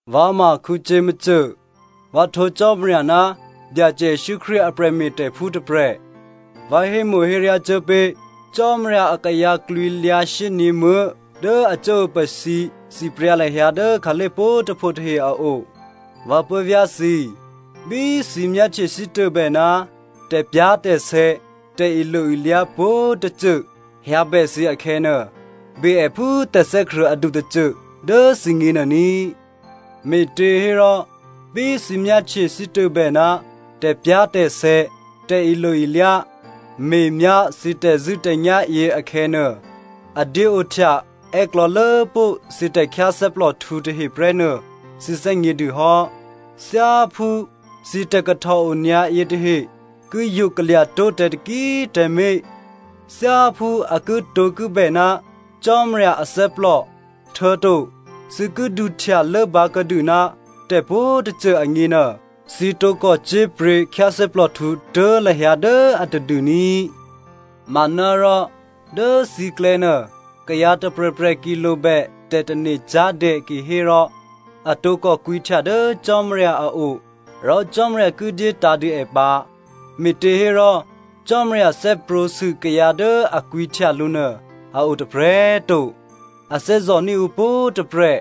Vǎ ma Jakomo, vǎ htwǒ Cò́marya ná Byacè Jesǔ Krístu a prè̤me̤tè̤phú tôprè̤. Vǎ hémo̤héryá cuố pé̤ Cò́marya akayǎ klwǐlyǎ shyényě̤muố̤ dố a cuốopasǐ sipryǎ lahyǎ dố khǎlé̤ pwǒ̤꤮ tôpho tahe a o. Vǎ puố̤vyá̤ thǐ꤮, bí thǐ myáhtye sítôbè ná tè̤pyá̤tè̤sè̌ tè̤ilo-ilyá pwǒ̤꤮ tôcô hyǎbè thǐ akhè̌nuô, be è phú tè̤thè́krṳ̂̌ adu tôcô dố thǐgně nuô ní꤮. Me̤těhérò, bí thǐ myáhtye sítôbè ná tè̤pyá̤tè̤sè̌ tè̤ilo-ilyá me̤myá thǐ tè̤zṳ̂́tè̤nyá̤ yěakhè̌nuô, a dyéohtya è́klò̌lốpó̤ thǐ tè̤khyáthè́plòhtǔ tahe prè́nuô thǐ thè́gnědû hò́. Thyáphú thǐ tè̤kahtòonyǎ yětahe ki yokalya̤ tó̤ tǎ taki꤮ tǎmé̤, thyáphú a kitǒkibè ná Cò́marya athè́plò, htuô̌to thǐ ki duhtya lốbǎkuô̌dû ná tè̤pwǒ̤꤮ tôcô agněnuô, thǐ tǒkò cyé̤pryě̤ khyáthè́plòhtǔ tuố̤ lahyǎ dố a tadû ní꤮. Manárò dố thǐklè̌ nuô, kayǎ tôprè̤prè̤ ki lobè tè̤tane̤cyá̤dè kihérò, a tǒkò kwǐhtya dố Cò́marya a o rò Cò́marya ki dyétǎ̤ dû è pǎ me̤těhérò, Cò́marya thè́prwǒ̤sû kayǎ dố a kwǐhtya lǔ nuô a otôprè̤꤮ to. A thè́zò̤ní̤ ǔ pwǒ̤꤮ tôprè̤,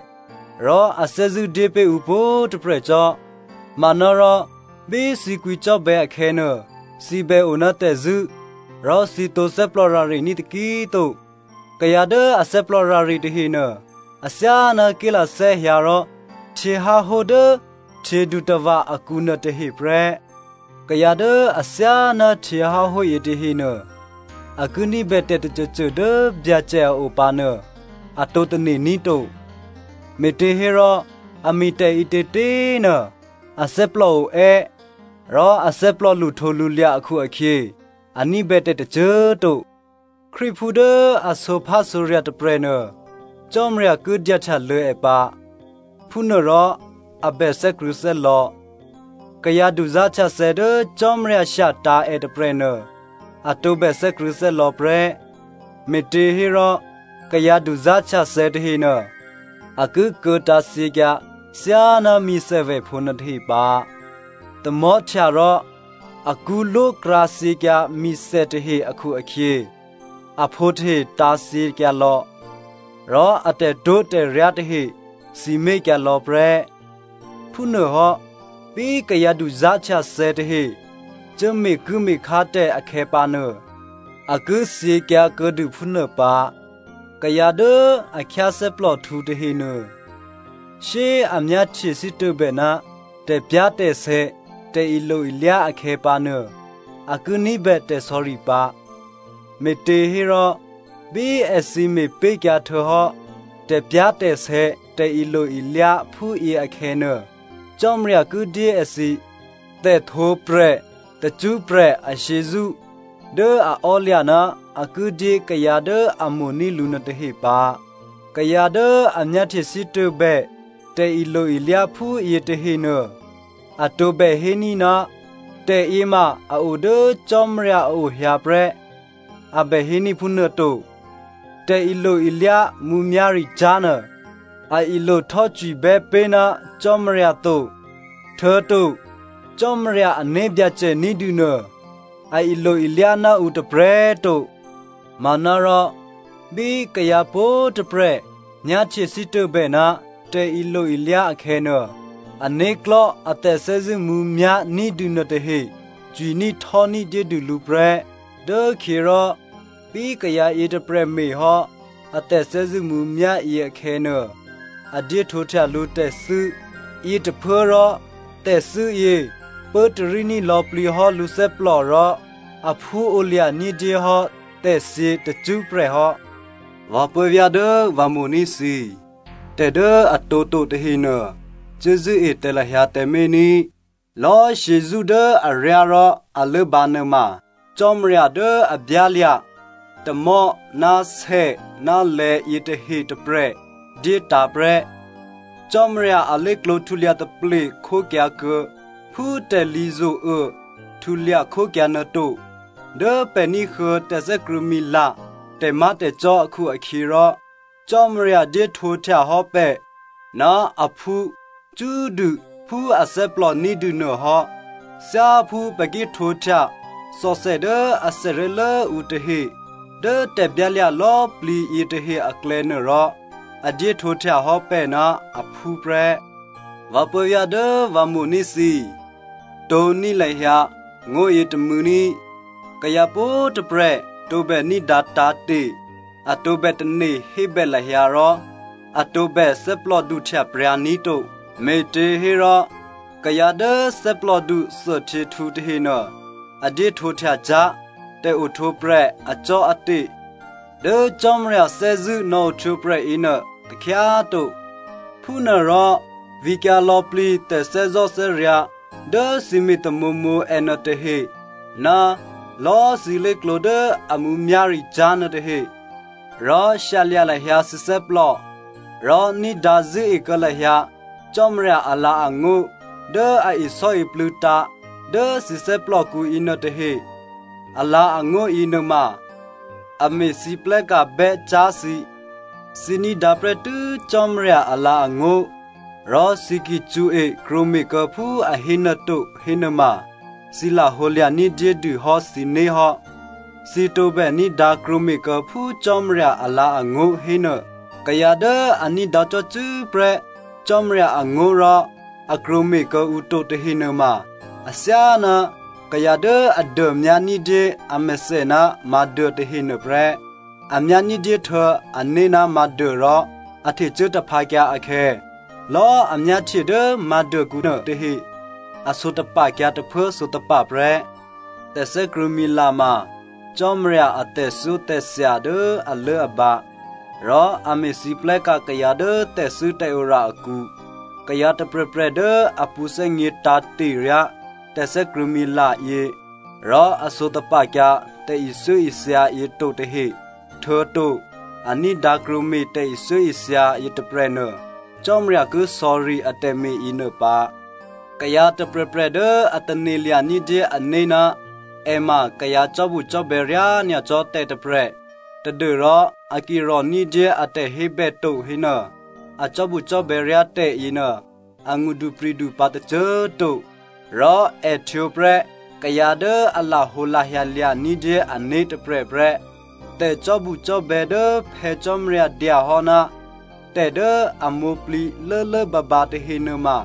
rò a thè́zṳ̂́ dyé pé̤ ǔ pwǒ̤꤮ tôprè̤ cò́. Manárò, bí thǐ kwǐcò́bè̌ akhè̌nuô, thǐ bè o ná tè̤zṳ̂́, rò thǐ tǒ thè́plòrarení̤ taki꤮ to. Kayǎ dố a thè́plòrare tahenuô, athyáná ké̤lathè́ hyǎ rò htyěháhó dố htyědutava̤ akǔ nuôtahe prè́. Kayǎ dố athyáná htyěháhó yětahenuô, a ki ní̤bè tè̤ tôcôcô dố Byacè a o pǎ nuô, a tǒ tane̤ ní̤ to, me̤těhérò a me̤tè̤ ǐtětě꤮ nuô, athè́plò oè́ rò athè́plò lṳhtǒlṳlya̤ akhu-akhyě, a ní̤bè tè̤ tôcô꤮ to. Krístuphú dố a sǒphásǒrya̤ tôprè̤nuô, Cò́marya ki dyahtyalô̌ è pǎ, phúnuôrò a bè thè́krṳ̂̌thè́lò̌. Kayǎ duzá̤htyathè̌ dố Cò́marya shyatǎ̤ è tôprè̤nuô, a tǒbè thè́krṳ̂̌thè́lò̌ prè́, me̤těhérò kayǎ duzá̤htyathè̌ tahenuô a ki kuô̌tǎ̤thyěkyǎ thyáná mi̤thèvèphǒ nuôtahe pǎ. Tamò̤́htya rò akṳ́lwókrǎ thyěkyǎ mi̤thè tahe akhu-akhyě, aphǒ tahe tǎ̤thyěkyǎ lò̌, rò a tè̤twó̤tè̤ryá tahe sǐmé̤kyǎ lò̌ prè́. Phúnuôhò́ bí kayǎ duzá̤htyathè̌ tahe cuố me̤kuố̤me̤khá tè̤ akhè̌pǎnuô, a ki thyěkyǎ kuô̌dû phúnuô pǎ. Kayǎ dố a khyáthè́plòhtǔ tahenuô, shyé꤮ a myáhtye sítôbè ná tè̤pyá̤tè̤sè̌ tè̤ilo-ilyá akhè̌pǎnuô, a ki ní̤bè tè̤sò̌ri pǎ, me̤těhérò bí èthǐ me̤pé̤kyǎ htuô̌hò́ tè̤pyá̤tè̤sè̌ tè̤ilo-ilyá phúyě akhè̌nuô, Cò́marya ki dyé èthǐ tè̤htwǒprè̤ tacṳ́prè̤ ashyězṳ́ dố a ò́lya̤ ná a ki dyé kayǎ dố a mo̤ní̤ lǔ nuôtahe pǎ. Kayǎ dố a myáhtye sítôbè tè̤ilo-ilyá phúyě tahenuô, a tǒbè héní̤, “Tè̤yěma a o dố Cò́marya a o hyǎ prè́,” a bè héní̤ phúnuô to. Tè̤ilo-ilyá mǔmyá̤ricyá̤ nuô a ilohtò́cwibè́ pé̤ ná Cò́marya to. Htuô̌to Cò́marya ané̤byacè ní̤dûnuô, a ilo-ilyá ná ǔ tôprè̤꤮ to. Manárò bí kayǎ pwǒ̤꤮ tôprè̤ myáhtye sítôbè ná tè̤ilo-ilyá akhè̌nuô, ané̤klò̤́ a tè̤thè́zṳ̂́ mǔmyá̤ ní̤dû nuôtahe cwiní̤htò́ní̤ dyédû lǔ prè́. Dốkhyěrò bí kayǎ yětôprè̤ me̤hò́ a tè̤thè́zṳ̂́ mǔmyá̤ yěakhè̌nuô, a dyéhtwǒhtya lǔ tè̤thû́, yětôphuốrò tè̤thû́ yě pốtaríní̤ lò̌plǐ hò́ lǔthè́plò rò aphúolya̤ ní̤dyéhò́ tè̤thyě tacṳ́prè̤ hò́. Vǎ puố̤vyá̤ dố vǎ mo̤ní̤ thǐ꤮, tè̤ dố a tǒto tahenuô, cuốzṳ̂́e tǎ lahyǎ tǎmé̤ ní꤮. Lò̌꤮ shyězṳ́ dố aryá rò a lốbǎ nuôma Cò́marya dố a byálya̤ tamò̤́ ná sè ná lè̌ yětahe tôprè̤ dyétǎ̤ prè́. Cò́marya alé̤klǒ htulya taplekhókyǎ kuô̌ phú tè̤lǐ zo̤uô htulya khókyǎ nuôto. Dố pè̤ ní̤huô̌ tè̤thè́krṳ̂̌mila tè̤má̤tè̤cò́ akhu-akhyěrò Cò́marya dyéhtwǒhtya hò́ pè̤ ná aphú cṳ́꤮ dû phú athè́plò ní̤dû nuôhò́. Thyáphú pè̤ ki htwǒhtya thòthè dố athè ré̤lố ǔ tahe dố tè̤byálya̤ lò̌꤮ plǐ yětahe aklè̌ nuôrò, a dyéhtwǒhtya hò́ pè̤ ná aphú prè́. Vǎ puố̤vyá̤ dố vǎ mo̤ní̤ thǐ꤮, tǒ̤ní̤ lahyǎ ngó̤ yětômû̌ ní꤮. Kayǎ pwǒ̤꤮ tôprè̤ tǒbè ní̤dǎ tǎ̤te̤, a tǒbè tane̤hébè lahyǎ rò a tǒbè thè́plòduhtya pryǎ ní̤ to. Me̤těhérò, kayǎ dố thè́plòdu thuôhtyěhtǔ tahenuô, a dyéhtwǒhtya cyá̤ tè̤ohtwǒprè̤ acò́ate̤ dố Cò́marya thè́zṳ̂́ nò̌ohtwǒprè̤ yěnuô takhyá꤮ to. Phúnuôrò vǐkyǎ lò̌plǐ tè̤thè́zò̤́thè́ryǎ̤ dố thǐ me̤ tamǒmǒ ènuôtahe ná lò̌꤮ thǐ lé̤klǒ dố a mǔmyá̤ricyá̤ nuôtahe. Rò shyalya̤ lahyǎ thǐ thè́plò rò ní̤dǎ zṳ̂́e kuô̌ lahyǎ Cò́marya alǎ̤angó̤ dố a isò́iplû̌tǎ̤ dố thǐ thè́plòkǔ yěnuôtahe. Alǎ̤angó̤ yěnuôma a me̤lwóhteka̤ bè́cyá̤ thǐ. Thǐ ní̤dǎ prè́tû́ Cò́marya alǎ̤angó̤ rò thǐ ki cṳ̌e krwǒme̤kuô̌ phú a hénuô to hénuôma thǐ lahǒ lya̤ ní̤dyédû hò́ thǐné̤ hò́. Thǐ tǒbè ní̤dǎ krwǒme̤ kuô̌ phú Cò́marya alǎ̤angó̤ hénuô. Kayǎ dố a ní̤dǎ cò́cû́ prè́ Cò́marya angó̤ rò a krwǒme̤ kuô̌ǔ to tahe nuôma athyáná kayǎ dố a dômyá ní̤dyé amèthè ná mǎ̤duô tahe nuôprè́. A myá ní̤dyé htuô̌ ané̤ ná mǎ̤duô rò a htecuố taphǎkyǎ akhè̌, lò̌꤮ a myáhtye dố mǎ̤duôkǔ nuôtahe, a sǒtapa̤kyǎ tôphuố sǒtapa̤ prè́. Tè̤thè́krṳ̂̌mila ma Cò́marya a tè̤thyótè̤thya dố alốabǎ rò a me̤lwóhteka̤ kayǎ dố tè̤thû́tè̤ora akǔ. Kayǎ tôprè̤prè̤ dố a pṳ̌thè́gně tǎ̤te̤ryá tè̤thè́krṳ̂̌mila yě rò a sǒtapa̤kyǎ tè̤ithyóithya yě to tahe, htuô̌to a ní̤dǎ krwǒme̤ tè̤ithyóithya yětôprè̤nuô, Cò́marya ki sò̌ri atè̤me̤ yěnuô pǎ. Kayǎ tôprè̤prè̤ dố a tane̤lya̤ ní̤dyé ané̤ ná è ma kayǎ cò́bucò́bè̌ ryá nyacò́ tè̤ tôprè̤, tadû́rò a ki rò̤ní̤dyé a tè̤hébè to hénuô, a cò́bucò́bè̌ ryá tè̤ yěnuô, angṳdupri̤du pǎ tôcô꤮ to, rò è htwǒ prè́ kayǎ dố a lahǒlahya lya̤ ní̤dyé ané̤ tôprè̤ prè́. Tè̤cò́bucò́bè̌ dố Phè̌ Cò́marya dya hò́ ná tè̤ dố a mwǒ̤plǐ lốlốbǎbǎ tahe nuôma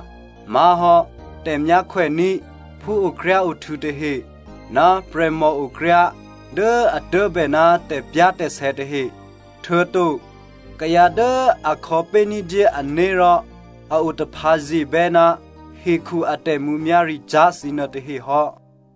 má̤hò́ tè̤myákhwèní̤ phúokryáohtû̌ tahe ná prè̤mòokryá dố a tuố̤bè ná tè̤pyá̤tè̤sè̌ tahe, htuô̌to kayǎ dố a khò̌pé̤ ní̤dyé ané̤ rò a otaphǎye̤bè́ ná hekhu a tè̤mǔmyá̤ricyá̤ thǐ nuôtahe hò́.